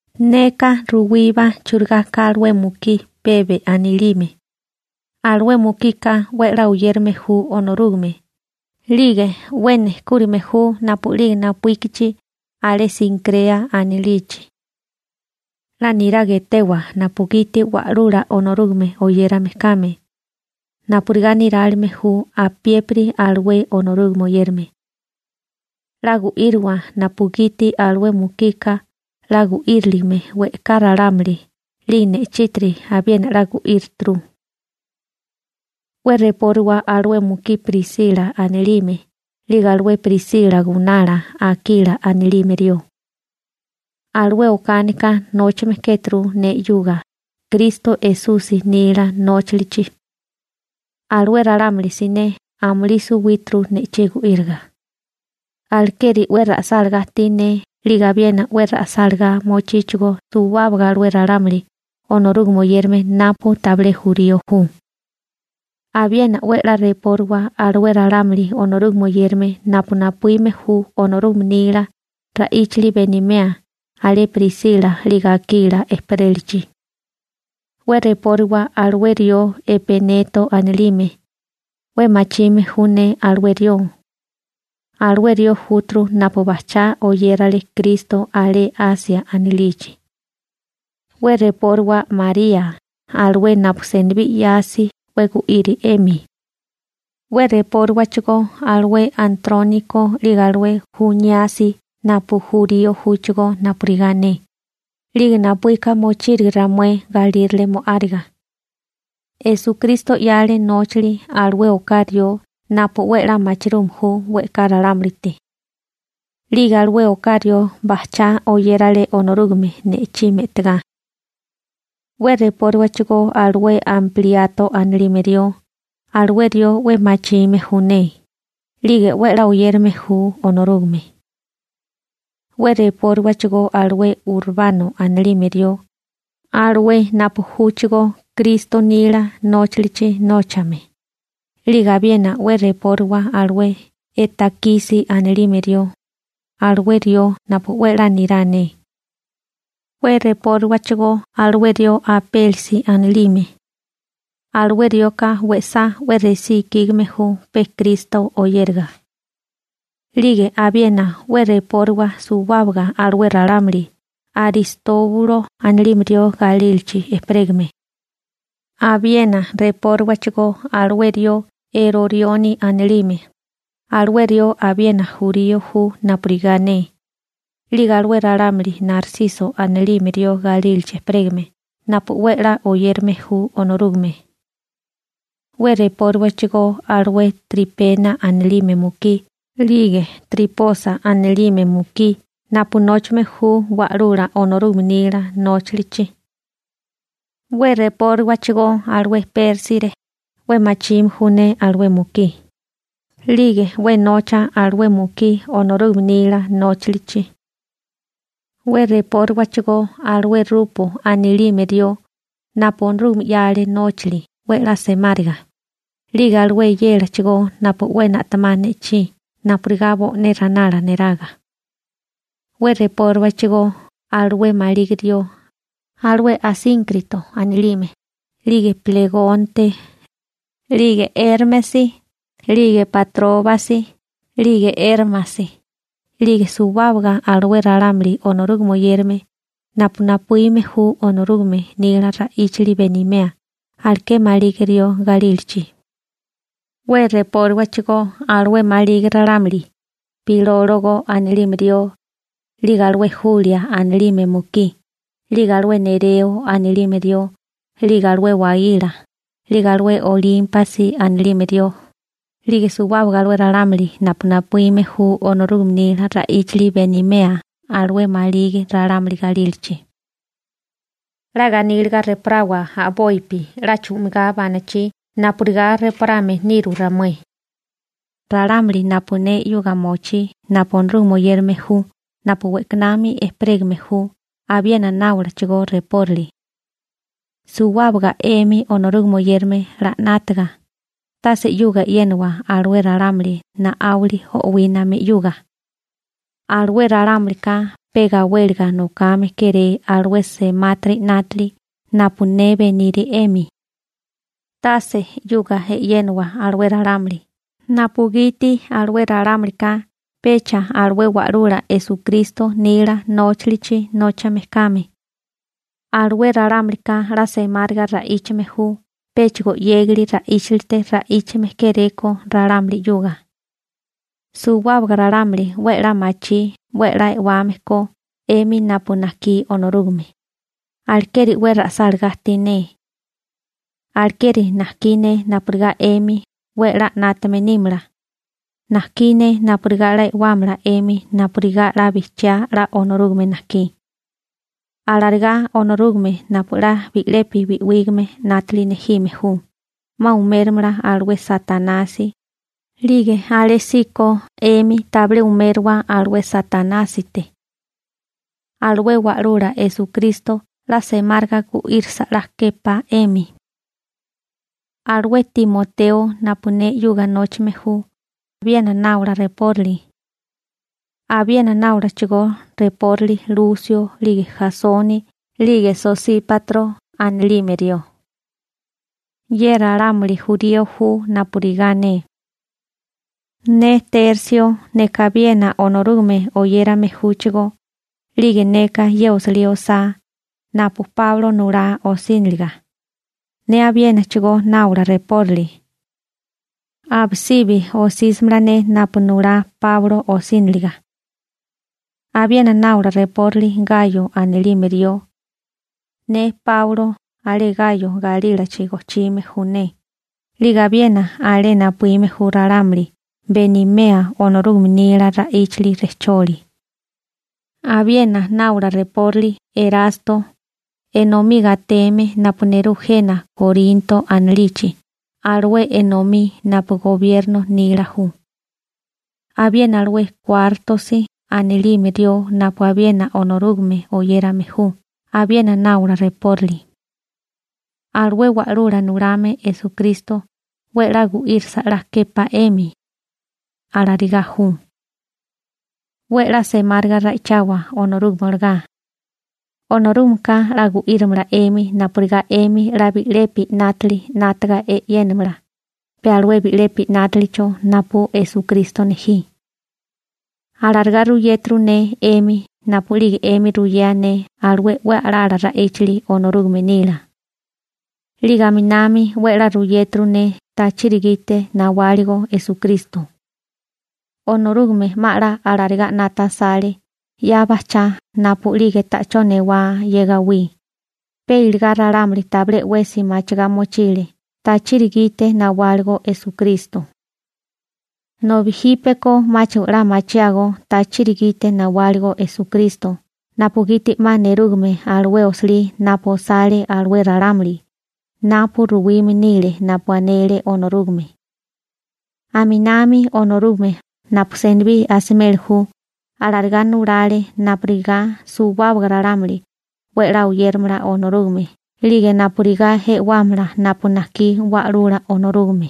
Neka ruwíbá churigá ka alué mukí Pebe anilime. Alué mukika 'we 'la oyérame ju Onorúgame 'lige 'we nejkúrime ju napu'lige napuíkichi alé Sinkrea anilichi. 'La niraga etewa napugiti Wa'lula Onorúgame oyérame kame, napurigá nirálime ju apiépiri alué Onorúgame oyérame. 'La gu'íriwa napugiti alué mukika 'la gu'íriligime we'ká ralámuli 'lige ne'chítiri abiena 'la gu'írituru. 'We repóriwa alué mukí Prisila anilime 'lige alué Prisila gunala Akila anilime rió. Alué okánika nóchame kéturu ne 'yuga Kristo Esusi nila nóchalichi. Alué ralámuli siné amulí suwíturu ne'chí gu'íriga. Alekeri 'we ra'sálagá ajtí ne 'lige abiena 'we ra'sálagá mochíchigó suwábaga alué ralámuli Onorúgame oyérame napu tabilé jurío ju. Abiena 'we 'la repóriwa alué ralámuli Onorúgame oyérame napu napuíme ju Onorúgame nila ra'íchali benimea alé Prisila 'lige Akila ejperélachi. 'We repóriwa alué rió Epeneto anilime, 'we machime ju ne alué rió. Alué rió júturu napu bajchá oyérale Kristo alé Asia anilichi. 'We repóriwa María, alué napu senibí 'yasi 'we gu'iri 'emi. 'We repóriwachigó alué Antróniko 'lige alué Juníasi napu jurío júchigó napurigá ne, 'lige napuíka mochírige ramué galírale mo'áriga. Esukristo 'yale nóchali alué oká rió napu 'we 'la machirume ju we'ká ralámulite. 'Lige alué oká rió bajchá oyérale Onorúgame ne'chí me'tigá. 'We repóriwachigó alué Ampliato anilime rió, alué rió 'we machime ju ne, 'lige 'we 'la oyérame ju Onorúgame. 'We repóriwachigó alué Urbano anilime rió, alué napu júchigó Kristo nila nóchilichi nóchame, 'lige abiena 'we repóriwa alué Etakisi anilime rió, alué rió napu 'we 'la nirá ne. 'We repóriwachigó alué rió Apélesi anilime. Alué rioka we'sá 'we resí ikígame ju pe Kristo oyériga. 'Lige abiena 'we repóriwa suwábaga alué ralámuli Aristóbulo anilime rió galílachi ejperégame. Abiena repóriwachigó alué rió Erorioni anilime, alué rió abiena jurío ju napurigá ne, 'lige alué ralámuli Narsiso anilime rió galílachi ejperégame napu 'we 'la oyérame ju Onorúgame. 'We repóriwachigó alué Tripena anilime mukí 'lige Triposa anilime mukí napu nóchame ju Wa'lula Onorúgame nila nóchilichi. 'We repóriwachigó alué Pérsire, 'we machime ju ne alué mukí, 'lige 'we nocha alué mukí Onorúgame nila nóchalichi. 'We repóriwachigó alué Rupo anilime rió, napu Onorúgame 'yale nóchali 'we 'la semáriga, 'lige alué eyélachigó napu 'we na'temá ne'chí napurigá bo'né ranala neraga. 'We repóriwachigó alué maligi rió, alué Asínkrito anilime, 'lige Plegonte, 'lige Érmesi, 'lige Patróbasi, 'lige Érmasi, 'lige suwábaga alué ralámuli Onorúgame oyérame napu napuíme ju Onorúgame nila ra'íchali benimea aleké maligi rió galílachi. 'We repóriwachigó alué maligi ralámuli, Pilólogo anilime rió, 'lige alué Julia anilime mukí, 'lige alué Nereo anilime rió, 'lige alué waíla, 'lige alué Olímpasi anilime rió, 'lige suwábaga alué ralámuli napu napuíme ju Onorúgame nila ra'íchali benimea alué maligi ralámuli galílachi. 'La ganíliga reporawa a'bopi 'la chu'migá banachí napurigá reporame niru ramué. Ralámuli napu ne 'yuga mochí napu Onorúgame oyérame ju napu we'kanami ejperégame ju abiena náolachigó reporali. Suwábaga 'emi Onorúgame oyérame 'la 'nátaga, tase 'yuga e'yénawa alué ralámuli na'áwali o'wíname 'yuga. Alué ralámulika pe gawéliga nokame kéré alué semátiri 'nátili napu ne beniri 'emi. Tase 'yuga e'yénawa alué ralámuli napugiti alué ralámulika pecha alué Wa'lula Esukristo nila nóchalichi nóchame kame. Alué ralámulika 'la semáriga ra'íchame ju péchigo 'yégali ra'íchalite ra'íchame kéréko ralámuli 'yuga. Suwábaga ralámuli 'we 'la machí 'we 'la e'wame ko 'emi napu najkí Onorúgame, alekeri 'we ra'sálagá ajtí ne. Alekeri najkí ne napurigá 'emi 'we 'la 'nátame nímala, najkí ne napurigá 'la e'wámala 'emi napurigá 'la bijchiá 'la Onorúgame najkí. Alarigá Onorúgame napu 'la bi'lepi bi'wígame 'nátili nejime ju, 'ma umérimala alué Satanasi 'lige alésíko 'emi tabilé umériwa alué Satanásite. Alué Wa'lula Esukristo 'la semáriga gu'írasa 'la képá 'emi. Alué Timoteo napu ne 'yuga nóchame ju abiena náwala reporali. Abiena náwalachigó reporali Lusio 'lige Jasoni 'lige Sosípatro anilime rió. Ye ralámuli jurío ju napurigá ne. Ne Tersio, neka abiena Onorúgame oyérame júchigó, 'lige neka ye osilí osá napu Páulo nulá osíniliga, ne abiénachigó náola reporali. Abisibi osísimala ne napu nulá Páulo osíniliga. Abiena náola reporali Gayo anilime rió. Ne Páulo alé Gayo galílachi gojchime ju ne, 'lige abiena alé napuíme ju ralámuli benimea Onorúgame nila ra'íchali rejcholi. Abiena náola reporali Erasto, enomí gateme napu nerú jena Korinto anilichi alué enomí napu gobierno nila ju. Abiena alué Kuártosi anilime rió napu abiena Onorúgame oyérame ju abiena náola reporali. Alué Wa'lula Nulame Esukristo 'we 'la gu'írasa 'la képá 'emi. Alarigá ju. ¡'We 'la semáriga ra'ichawa Onorúgame olagá! Onorúgameka 'la gu'írimala 'emi napurigá 'emi 'la bi'lepi 'nátili 'nátaga e'yénamala pe alué bi'lepi 'nátilicho napu Esukristo nejí. Alarigá ruyéturu ne 'emi napu'lige 'emi ruyea ne alué 'we a'lá ra'íchali Onorúgame nila. 'Lige aminami 'we 'la ruyéturu ne tachiri gite nawáligo Esukristo. Onorúgame 'ma 'la alarigá 'nata asale 'ya bajchá napu'lige ta'chó newá ye gawí, pe iligá ralámuli tabilé 'wesi machigá mochile tachiri gite nawáligo Esukristo. Nobi jípeko 'máchigo 'la machiágó tachiri gite nawáligo Esukristo napugiti 'ma nerúgame alué osilí napu osale alué ralámuli napu ruwime nile napu anele Onorúgame. Aminami Onorúgame napu senibí asimeli ju alarigá nulale napurigá suwábaga ralámuli 'we 'la oyéramala Onorúgame 'lige napurigá e'wámala napu najkí Wa'lula Onorúgame.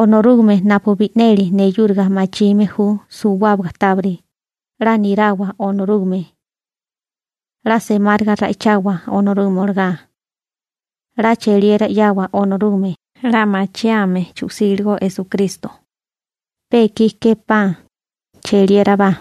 Onorúgame napu bi'neli neyúriga machime ju suwábaga tábiri, 'la nirawa Onorúgame. 'La semáriga ra'ichawa Onorúgame olagá. 'La cheliera 'yawa Onorúgame 'la machiame chu'síligo Esukristo. Pe ekí képá. Cheliérabá.